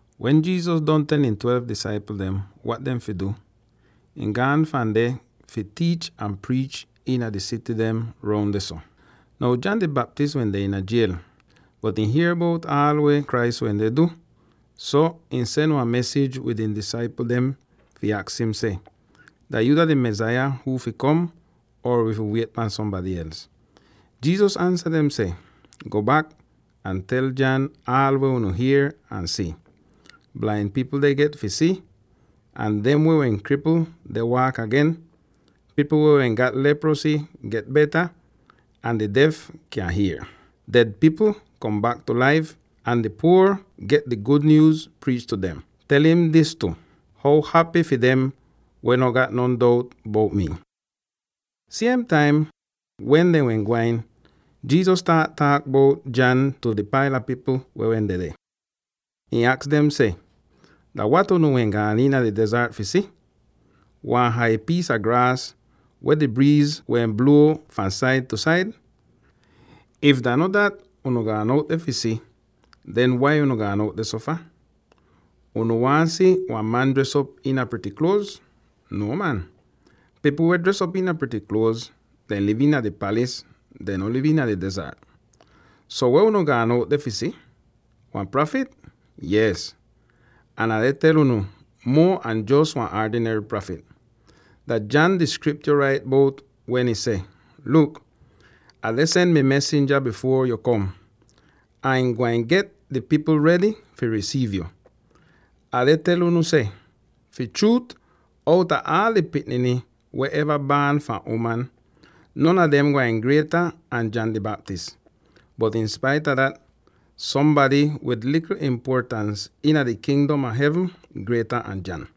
Wen Jesus don tel ihn twelve disaipl dem wat dehn fi du, ihn gaan fahn deh fi tiich ahn priich iina di sity dem roun dehso. Now, John di Baptist wende iina jiel, bot ihn hier bout aal weh Christ wende du, so ihn sen wan mesij wid ihn disaipl dem fi aks im seh, “Dah yuu dah di Mesaya huu fi kom, or wi fi wiet pahn sombady els?” Jesus ansa dem seh, “Go bak ahn tel John aal weh unu hier ahn si: blain pipl dehn get fi si, ahn dem weh wehn kripl deh waak agen; pipl weh wehn gat leprosy get beta, ahn di def kyan hier. Ded pipl kom bak tu laif, ahn di puor pipl dem get di gud nyuuz priich tu dem. Tel im dis tu: How hapy fi dem weh no gat non dout bout mii.” Siem taim wen dehn wehn gwain, Jesus staat taak bout John tu di paila pipl weh wehn dedeh; ihn aks dem seh, “Dah wat unu wehn gaan iina di dezart fi si? Wan hai piis a graas weh di briiz deh bluo fahn said tu said? If dah no dat unu gaan out deh fi si, den wai unu gaan out dehso fah? Unu waahn si wan man dres op iina prity kluoz? No man; pipl weh dres op iina prity kluoz, dehn liv iina dehn palis; dehn no liv iina di dezart. So, weh unu gaan out deh fi si? Wan prafit? Yees, ahn Ah deh tel unu, muo an jos wan aadinary prafit. Dah John di Skriptyo rait bout weh ih seh: ‘Luk! Ah deh sen mi mesinja bifuor yu kom, ahn ihn gwain get di pipl redy fi risiiv yu.’ Ah deh tel unu seh: fi chruut, outa aal di pikniny weh eva baan fahn uman, non a dem gwain grieta an John di Baptist. Bot inspaita dat, sombady wid likl impuotans iina di Kingdom a Hevn grieta an John.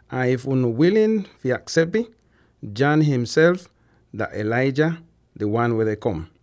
—ahn if unu wilin fi aksep ih— John ihnself dah Elijah, di wan weh deh kom.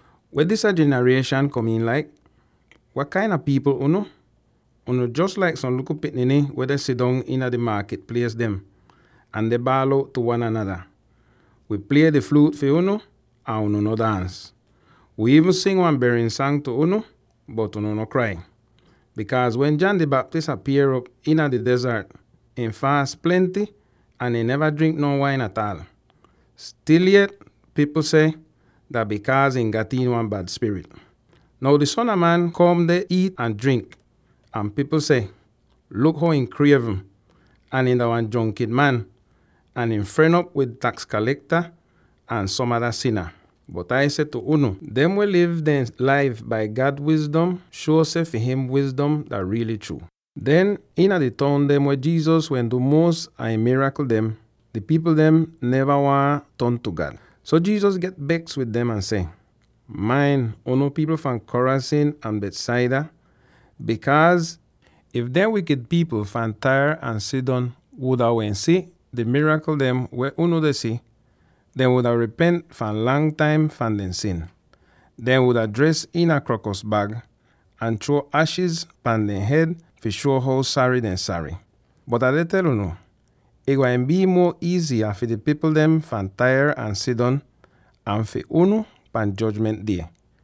“Weh disya jinarieshan kom'in laik? Wat kain a pipl unu? Unu jos laik som likl pikniny weh deh sidong iina di maakit plies dem, ahn deh baal out tu wan anada: ‘Wi plie di fluut fi unu, ahn unu no daans; wi iivn sing wan berin sang tu unu, bot unu no krai!’ Bikaaz wen John di Baptist apier'op iina di dezart, ihn faas plenty ahn ihn neva drink no wain ataal; stil yet pipl seh, ‘Dah bikaaz ihn gat iin wan bad spirit!’ Now di Son a Man kom deh iit ahn drink, ahn pipl seh, ‘Luk how ihn krievn, ahn ihn dah wan jronkin man, ahn ihn fren op wid taks kalekta ahn som ada sina.’ Bot Ai seh tu unu: dem weh liv dehn laif bai God wizdom shuo seh fi him wizdom dah riily chruu.” Den, iina di toun dem weh Jesus wehn du muos a ihn mirakl dem, di pipl dehn neva waahn ton tu God. So Jesus get beks wid dem ahn seh, “Main, unu pipl fahn Chorazin ahn Bethsaida, bikaaz if dehn wikid pipl fahn Tyre ahn Sidon wuda wehn si di mirakl dem weh unu deh si, dehn wuda ripent fahn lang taim fahn dehn sin. Dehn wuda dres iina krokos bag, ahn chruo ashis pahn dehn hed fi shuo how sary dehn sary. Bot Ah deh tel unu: ih gwain bii muo iiziya fi di pipl dem fahn Tyre ahn Sidon an fi unu pan Jojment Die.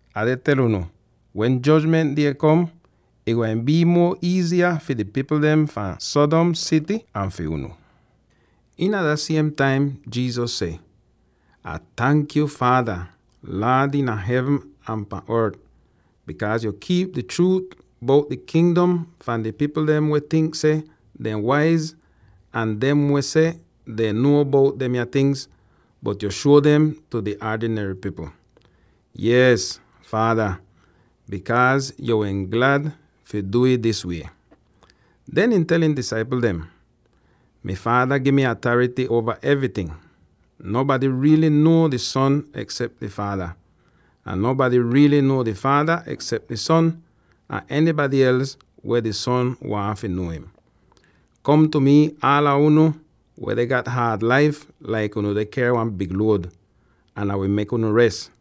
Ah deh tel unu: wen Jojment Die kom, ih gwain bii muo iiziya fi di pipl dem fahn Sodom sity an fi unu!” Iina dah siem taim Jesus seh, “Ah tank yuu, Faada, Laad iina hevn ahn pahn ort, bikaaz yo kiip di chruut bout di Kingdom fahn di pipl dem weh tink seh dehn waiz ahn dem weh seh dehn nuo bout demya tingz, bot yo shuo dem tu di aadinary pipl. Yees, Faada, bikaaz yo wehn glad fi du'ih dis wie.” Den ihn tel ihn disaipl dem, “Mi Faada gi mi atarity uova evryting. Nonbady riily nuo di Son eksep di Faada, ahn nonbady riily nuo di Faada eksep di Son, ahn enybady els weh di Son waahn fi nuo im.” “Kom tu mi aala unu weh deh gat haad laif laik unu deh ker wan big luod; ahn Ah wi mek unu res.